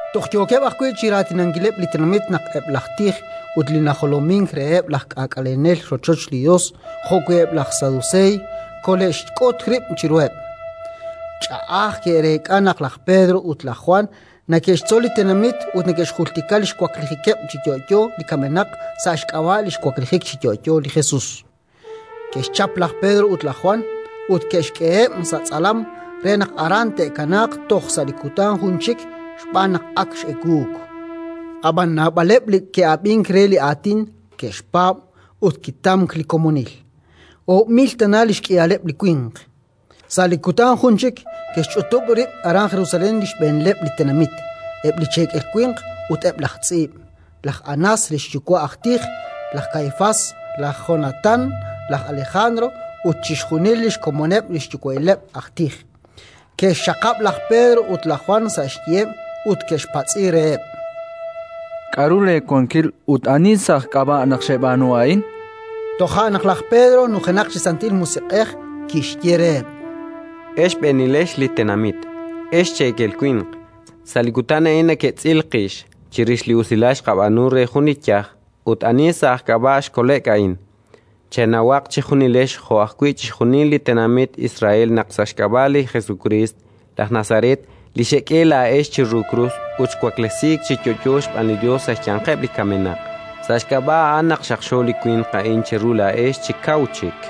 Toj yookeb' ajwi' chi raatinankileb' li tenamit naq eb' laj tij ut li najolomink reheb' laj k'aak'alenel rochoch li Yos jo'wi' eb' laj Saduseey kole'xk'ut rib' chiruheb': ch'a'aj ke'reek'a naq laj Pedro ut laj Jwan neke'xtzol li tenamit ut neke'xjultika li xwaklijikeb' chi yo'yo li kamenaq sa' xk'ab'a' li xwaklijik chi yo'yo li Jesus. Ke'xchap laj Pedro ut laj Jwan ut ke'xk'eheb' sa' tz'alam re naq aran te'kanaaq toj sa' li kutan jun chik xb'aan naq ak x'ewuuk. Ab'anan naab'aleb' li ke'ab'ink re li Aatin, ke'xpaab', ut kitamk li komonil: oob' mil tana li xk'ihaleb' li winq. Sa' li kutan jun chik ke'xch'utub' rib' aran Jerusalén li xb'eenileb' li tenamit, eb' li cheekel winq ut eb' laj tz'iib', laj Anás, li xyuwa'il aj tij, laj Kaifás, laj Jonatán, laj Alejandro ut chixjunil li xkomoneb' li xyuwa'ileb' aj tij. Ke'xxaqab' laj Pedro ut laj Jwan sa' xyiheb' ut ke'xpatz'i reheb': —K'aru leewankil ut ani sa' aj k'ab'a' naq xeb'aanu a'in? chankeb'. Toja' naq laj Pedro, nujenaq chi Santil Musiq'ej, kixye reheb': —Ex xb'eenilex li tenamit, ex cheekel winq, sa' li kutan a'in neketz'il qix chirix li usilal xqab'aanu re jun li yaj ut ani sa' aj k'ab'a' xkole'k a'in. Chenawaq chejunilex jo'wi' chixjunil li tenamit Israel naq sa' xk'ab'a' li Jesukriist, laj Nazaret, li xek'e laa'ex chiru krus ut xwaklesiik chi yo'yo xb'aan li Yos sa' xyanqeb' li kamenaq, sa' xk'ab'a' a'an naq xaqxo li winq a'in cheru laa'ex chi kaw chik.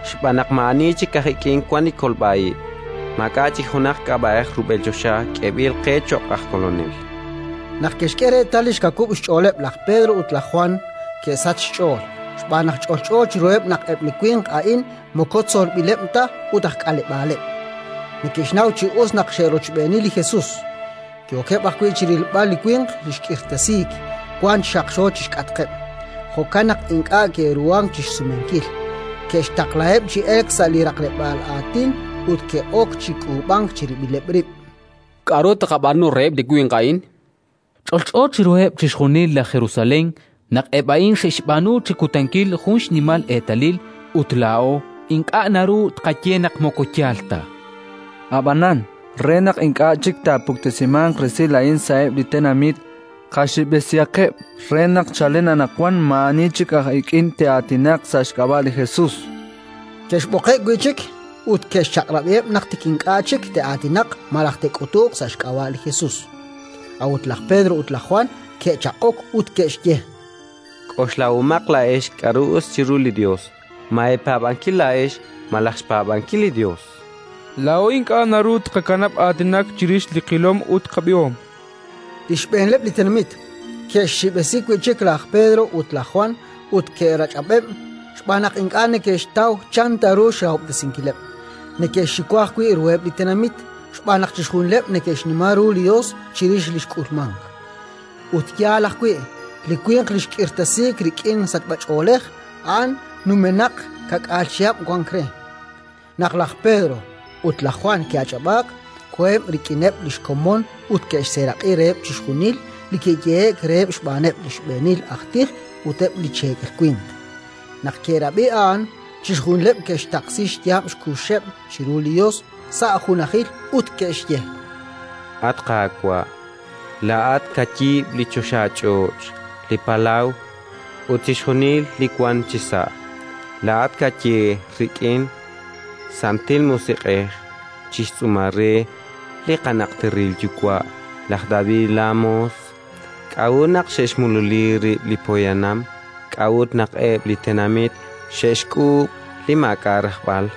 Xb'aan naq maa'ani chik aj ik'in wank li kolb'a ib'; maak'a' chik junaq k'ab'a'ej rub'el choxa k'eeb'il qe cho'q aj Kolonel. Naq ke'xk'e reetal li xkawub' xch'ooleb' laj Pedro ut laj Jwan, ke'sachk xch'ool, xb'aan naq ch'olch'o chiruheb' naq eb' li winq a'in moko tzolb'ileb' ta ut aj k'aleb'aaleb'. Neke'xnaw chi us naq xe'rochb'eeni li Jesus. Yookeb' ajwi' chi rilb'al li winq li xk'irtasiik, wank chi xaqxo chi xk'atqeb': jo'kan naq ink'a' ke'ruhank chi xsumenkil. Ke'xtaqlaheb' chi elk sa' li raqleb'aal aatin ut ke'ok chi k'uub'ank chirib'ileb' rib': —K'aru taaqab'aanu reheb' li winq a'in? -chankeb'-. Ch'olch'o chiruheb' chixjunil laj Jerusalén naq eb' a'in xe'xb'aanu chi kutankil jun xnimal eetalil, ut laa'o ink'a' naru tqaye naq moko yaal ta. Ab'anan, re naq ink'a' chik taapuktesimanq resil a'in sa'eb' li tenamit, qaxib'esihaqeb' re naq chalen anaqwan maa'ani chik aj ik'in te'aatinaq sa' xk'ab'a' li Jesus. Ke'xb'oqeb' wi' chik ut ke'xchaq'rab'iheb' naq tik ink'a' chik te'aatinaq malaj te'k'utuq sa' xk'ab'a' li Jesus. A'ut laj Pedro ut laj Jwan ke'chaq'ok ut ke'xye: —K'oxlahomaq laa'ex k'aru us chiru li Yos: ma eepaab'ankil laa'ex malaj xpaab'ankil li Yos? Laa'o ink'a' naru tqakanab' aatinak chirix li qilom ut qab'ihom. Li xb'eenileb' li tenamit ke'xxib'esi wi' chik laj Pedro ut laj Jwan ut ke'rach'ab'eb', xb'aan naq ink'a' neke'xtaw chan ta ru xrahob'tesinkileb'; neke'xxiwa ajwi' ruheb' li tenamit, xb'aan naq chixjunileb' neke'xnima ru li Yos chirix li xk'ulmank. Ut yaal ajwi': li winq li xk'irtasiik rik'in li sachb'ach'oolej, a'an numenaq ka'k'aal chihab' wank re. Naq laj Pedro ut laj Jwan ke'ach'ab'aak, koheb' rik'ineb' li xkomon ut ke'xseeraq'i reheb' chixjunil li kiyehe'k reheb' xb'aaneb' li xb'eenil aj tij ut eb' li cheekel winq. Naq ke'rab'i a'an, chixjunileb' ke'xtaqsi xyaab' xkuxeb' chiru li Yos sa' junajil ut ke'xye: “At Qaawa', laa'at kayiib' li choxach'och', li palaw ut chixjunil li wank chisa'; laa'at kaye rik'in Santil Musiq'ej chi xtz'uumal re li qanajteril yuwa' laj David laamoos: «K'a'ut naq xe'xmululi rib' li poyanam? K'a'ut naq eb' li tenamit xe'xk'uub' li maak'a' rajb'al?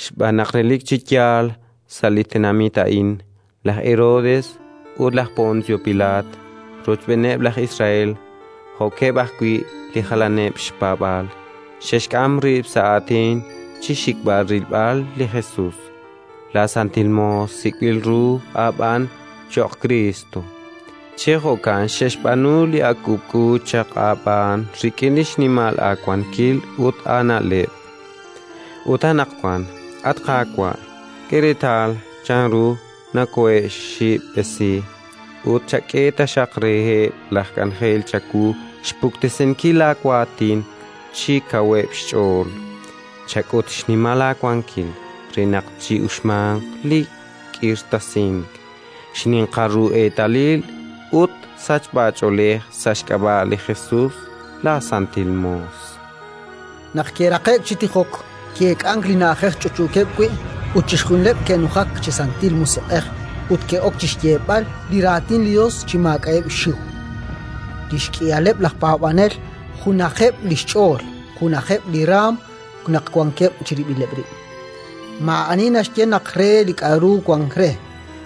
“Xb'aan naq relik chi yaal, sa' li tenamit a'in, laj Herodes ut laj Poncio Pilaat, rochb'eeneb' laj Israel jo'keb' ajwi' li jalaneb' xpaab'aal, xe'xk'am rib' sa' aatin chi xxikb'al rilb'al li Jesus, laasantil moos sik'b'il ru aab'aan cho'q Kriist. Chi jo'kan xe'xb'aanu li ak k'uub'k'u chaq aab'aan rik'in xnimal aawankil ut aana'leb'. Ut anaqwan, at Qaawa', k'e reetal chanru nokoohe'xxib'esi, ut chak'e taxaq reheb' laj k'anjel chawu xpuktesinkil laawaatin chi kaweb' xch'ool. Chak'ut xnimal aawankil re naq chi'uxmanq li k'irtasink, xninqal ru eetalil ut sachb'ach'oolej sa' xk'ab'a' li Jesus, laasantil moos”. Naq ke'raqe'k chi tijok, ki'eek'ank li na'ajej ch'utch'uukeb' wi', ut chixjunileb' ke'nujak chi Santil Musiq'ej ut ke'ok chi xyeeb'al li Raatin li Yos chi maak'a'eb' xxiw. Li xk'ihaleb' laj paab'anel junajeb' li xch'ool, junajeb' li raanm naq wankeb' chirib'ileb' rib'. Maa'ani naxye naq re li k'aru wank re,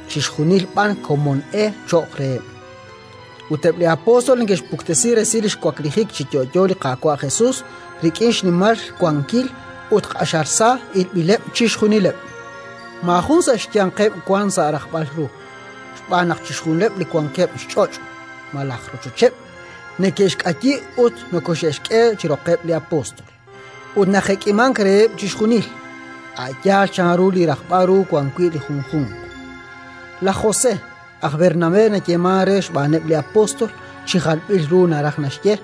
chixjunil b'an komon e cho'q reheb'. Ut eb' li apóstol neke'xpuktesi resil li xwaklijik chi yo'yo li Qaawa' Jesus rik'in xnimal wankil, ut q'axal sa ilb'ileb' chixjunileb'. Maajun sa' xyanqeb' wank sa' rajb'al ru, xb'aan naq chixjunileb' li wankeb' xch'och' malaj rochocheb', neke'xk'ayi ut nokoxe'xk'e chi roqeb' li apóstol, ut najek'imank reheb' chixjunil, a' yaal chanru li rajb'al ru wan wi' li junjunq. Laj José (aj Bernabé nayeemank re xb'aaneb' li apóstol; chi jalb'il ru naraj naxye: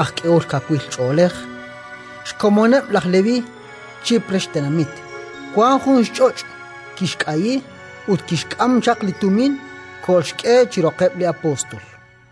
“aj k'ehol kawil ch'oolej”), xkomoneb' laj Leví, Chipre xtenamit, wank jun xch'och': kixk'ayi, ut kixk'am chaq li tumin, kolxk'e chi roqeb' li apóstol.